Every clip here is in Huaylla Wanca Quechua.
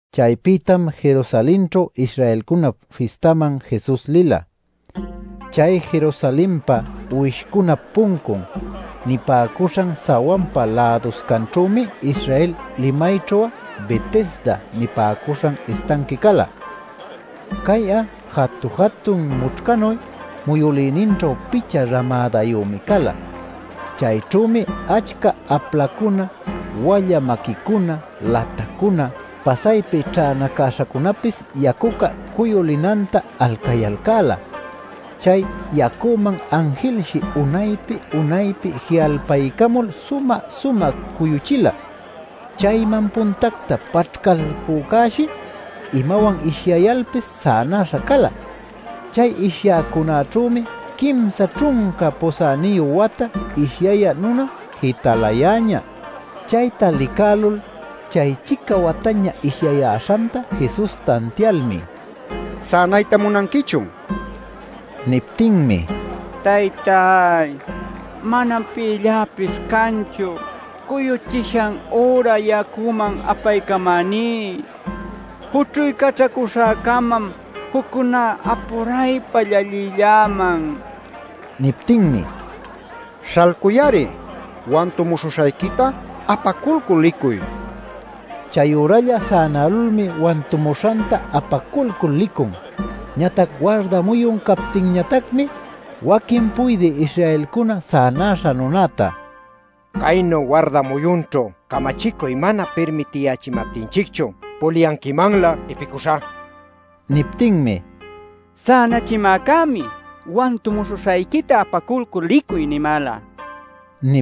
Chaypïtam Jerusalenćhu Israelcunap fistaman Jesus lila. Chay Jerusalenpa “Uwishcunap Puncun” nipäcuśhan sawanpa läduscanćhümi Israel limayćhu'a Betesda nipäcuśhan istanqui cala. Cay'a jatu-jatun mućhcanuy muyülïninćhu picha ramädayümi cala. Chayćhümi achca aplacuna, walla maquicuna, latacuna, pasaypi ćhänacäśhacunapis yacuca cuyulinanta alcayalcäla. ˻ Chay yacuman anjilshi unaypi unaypi ji'alpaycamul sumä-sumä cuyuchila. Chayman puntacta paćhcalpücäshi, imawan ishyayalpis sänaśha cala.˼ Chay ishyäcunäćhümi quimsa ćhunca pusäniyu wata ishyayä nuna jitalayäñä. Chayta licälul, chay-chica wataña ishyayäśhanta Jesus tantialmi: “¿Sänayta munanquichun?” nin. Niptinmi: “Taytay, manam pïlläpis canchu cuyuchishan üra yacuman apaycamäní. Jućhuycaćhacuśhäcamam juccuná apuraypa llallilläman” nin. Niptinmi: “¡Śhalcuy-ari! Wantumuśhuśhayquita apaculcul licuy” nin. Chayüralla sänälulmi wantumuśhanta apaculcul licun. Ñatac warda muyun captinñatacmi waquin puydï Israelcuna sänäśha nunäta: “¡Caynu warda muyunćhu camachicuy mana pirmitiyächimaptinchicchun puliyanquimanlä ipicuśha!” nin. Niptinmi “Sänachimäcämi, ‘Wantumuśhuśhayquita apaculcul licuy’ nimäla” nin.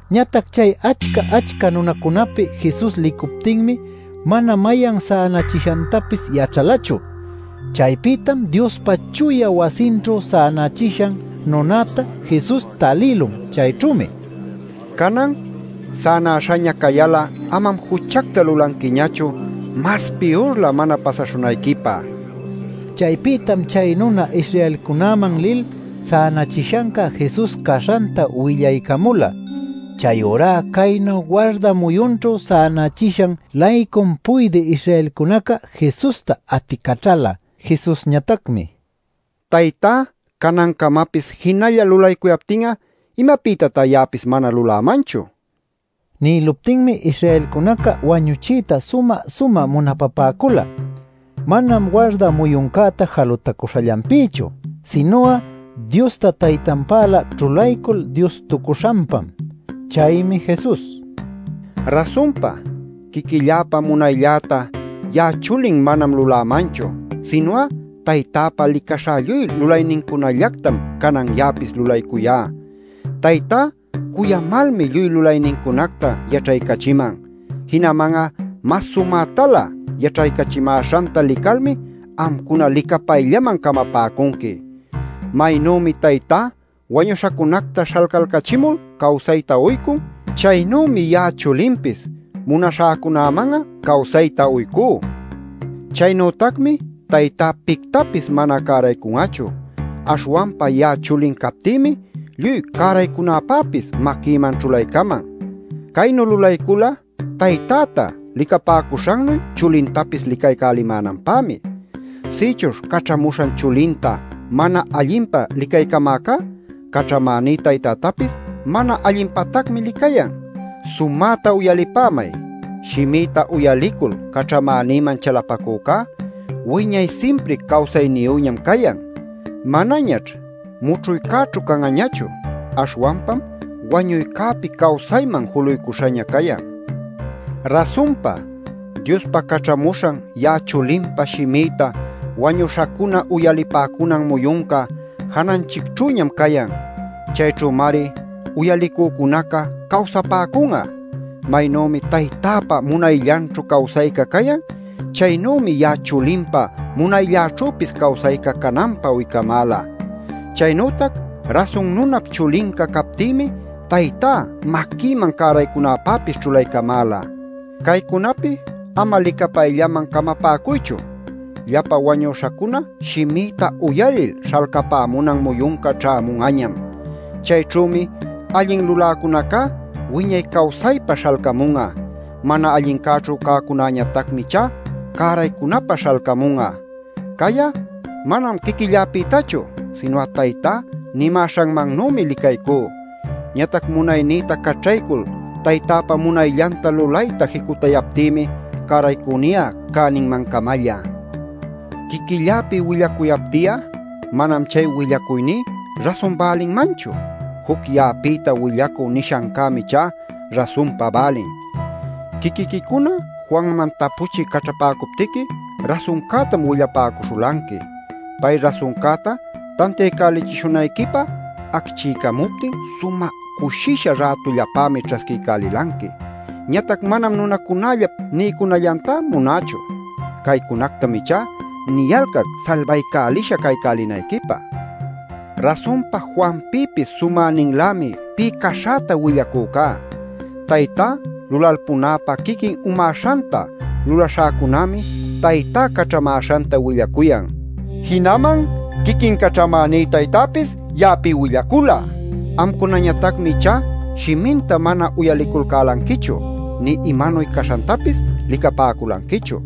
Ñatac chay achca-achca nunacunäpi Jesus licuptinmi mana mayan sänachishantapis yaćhalachu. Chaypïtam Diospa chuya wasinćhu sänachishan nunäta Jesus talïlun. Chayćhümi: “Canan sänaśhaña cayal'a amam juchacta lulanquiñachu mas piyurlä mana pasaśhunayquipä” nin. Chaypïtam chay nuna Israelcunäman lil, sänachishanca Jesus caśhanta willaycamula. Chayurá caynu warda muyunćhu sänachishan-laycum puydï Israelcunaca Jesusta aticaćhala. Jesusñatacmi: “Taytá canancamapis jinalla lulaycuyaptin'a ¿imapïtatá ya'apis mana lulämanchu?” nin. Nïluptinmi, Israelcunaca wañuchiyta sumä-sumä munapapäcula. Manam warda muyuncäta jalutacuśhallanpïchu, sinu'a Diosta Taytanpälä ćhulaycul Diostucuśhanpam. Chaymi Jesus: “Rasunpa, quiquilläpa munayllätá ya'a Chulin manam lulämanchu, sinu'a Taytäpa licaśha lluy lulaynincunallactam canan ya'apis lulaycuyá. “Taytá cuyamalmi lluy lulaynincunacta yaćhaycachiman. Jinaman'a mas sumätalä yaćhaycachimäśhanta licalmi amcuna licapayllaman camapäcunqui. Maynümi Taytá wañuśhacunacta śhalcalcachimul cawsayta uycun, chaynümi ya'a Chulinpis munaśhäcunäman'a cawsayta uycú. Chaynütacmi Taytá pictapis mana cäraycun'achu, aśhwanpa ya'a Chulin captïmi lluy cäraycunäpäpis maquïman ćhulaycaman. Caynu lulaycula Taytäta licapäcuśhannuy Chulintapis licaycälimänanpämi. Sïchuśh caćhamuśhan Chulinta mana allinpa licaycamäcá, caćhamäní Taytätapis mana allinpatacmi licayan. “Sumäta uyalipämay: shimïta uyalicul caćhamänïman chalapacücá wiñay simpri cawsayniyüñam cayan. Manañaćh mućhuycäćhu can'añachu. Aśhwanpam wañuycäpi cawsayman juluycuśhaña cayan. Rasunpa, Diospa caćhamuśhan ya'a Chulinpa shimïta wañüśhacuna uyalipäcunan muyunca jananchicćhüñam cayan. Chayćhümari uyalicücunaca cawsapäcun'a. Maynümi taytäpa munayllanćhu cawsayca cayan, chaynümi ya'a Chulinpa munaylläćhüpis cawsayca cananpä uycamäla. Chaynütac Rasun Nunap Chulinca captïmi Taytá maquïman cäraycunäpäpis ćhulaycamäla. “Caycunapi ama licapayllaman camapäcuychu: llapa wañüśhacuna shimïta uyalil śhalcapämunan muyunca ćhämun'añam. Chayćhümi allin luläcunacá wiñay cawsaypä śhalcamun'a; mana allincäćhu cäcunañatacmi ichá cäraycunäpä śhalcamun'a. “Cay'a manam quiquilläpïtachu, sinu'a Taytá nimäśhanmannümi licaycú. Ñatac munaynïta caćhaycul Taytäpa munayllanta lulayta jicutayaptïmi cäraycuyni'a cäninmancamalla. “Quiquilläpi willacuyapti'a, manam chay willacuyní rasun bälinmanchu. Juc ya'apïta willacü nishancämi ichá rasunpa bälin. Quiquiquicuna Juanman tapuchï caćhapäcuptiqui, rasuncätam willapäcuśhulanqui. Pay rasuncäta tantiaycälichishunayquipä acchiycamuptin sumä cushisha rätullapämi ćhasquiycälilanqui. Ñatac manam nunacunällap niycunallantá munächu. Caycunactam ichá niyalcac salbaycälisha caycälinayquipä. Rasunpa Juanpïpis sumäninlämi pï caśhäta willacücá: Taytá lulalpunäpä quiquin umäśhanta lulaśhäcunämi Taytá caćhamäśhanta willacuyan. Jinaman quiquin caćhamäní Taytäpis ya'api willacula. Amcunañatacmi ichá shiminta mana uyaliculcälanquichu, nï imanuy caśhantapis licapäculanquichu.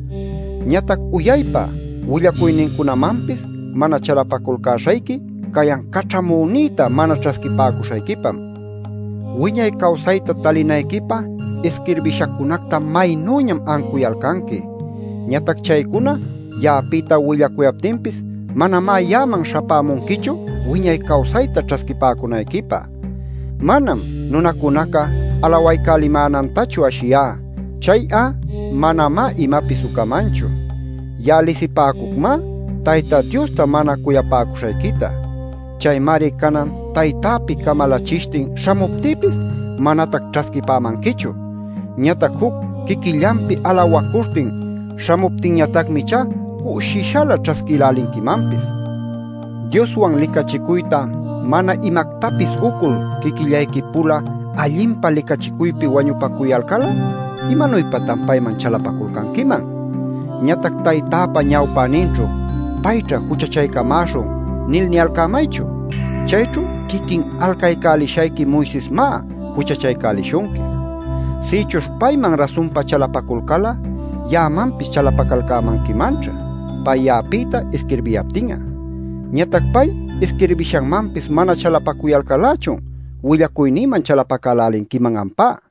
Ñatac uyaypa willacuynincunamanpis mana chalapaculcäśhayqui cayan caćhamüninta mana ćhasquipäcuśhayquipam. Wiñay cawsayta talinayquipä isquirbishacunacta maynüñam ancuyalcanqui. Ñatac chaycuna ya'apïta willacuyaptinpis manamá ya'aman śhapämunquichu wiñay cawsayta ćhasquipäcunayquipä. Manam nunacunaca alawaycälimänantachu ashiyá. Chay'a manamá imapis ucamanchu. Ya'a lisipäcucmá Tayta Diosta mana cuyapäcuśhayquita. Chaymari canan Taytäpi camalachishtin śhamuptïpis manatac ćhasquipämanquichu. Ñatac juc quiquillanpi alawacuśhtin śhamuptinñatacmi ichá cushishalä ćhasquïlälinquimanpis. Dioswan licachicuyta mana imactapis ucul, quiquillayqui-pula allinpa licachicuypi wañupacuyalcal'a, ¿imanuypatan payman chalapaculcanquiman? Ñatac Taytäpa ñawpäninćhu ‘Payćha juchachaycamäśhun’ nil niyalcämaychu. Chayćhu quiquin alcaycälishayqui Moisesmá juchachaycälishunqui. Sïchuśh payman rasunpa chalapaculcal'a ya'amanpis chalapacalcämanquimanćha, pay ya'apïta isquirbiyaptin'a. Ñatac pay isquirbishanmanpis mana chalapacuyalcal-lächun willacuynïman chalapacälälinquiman ampá” nin.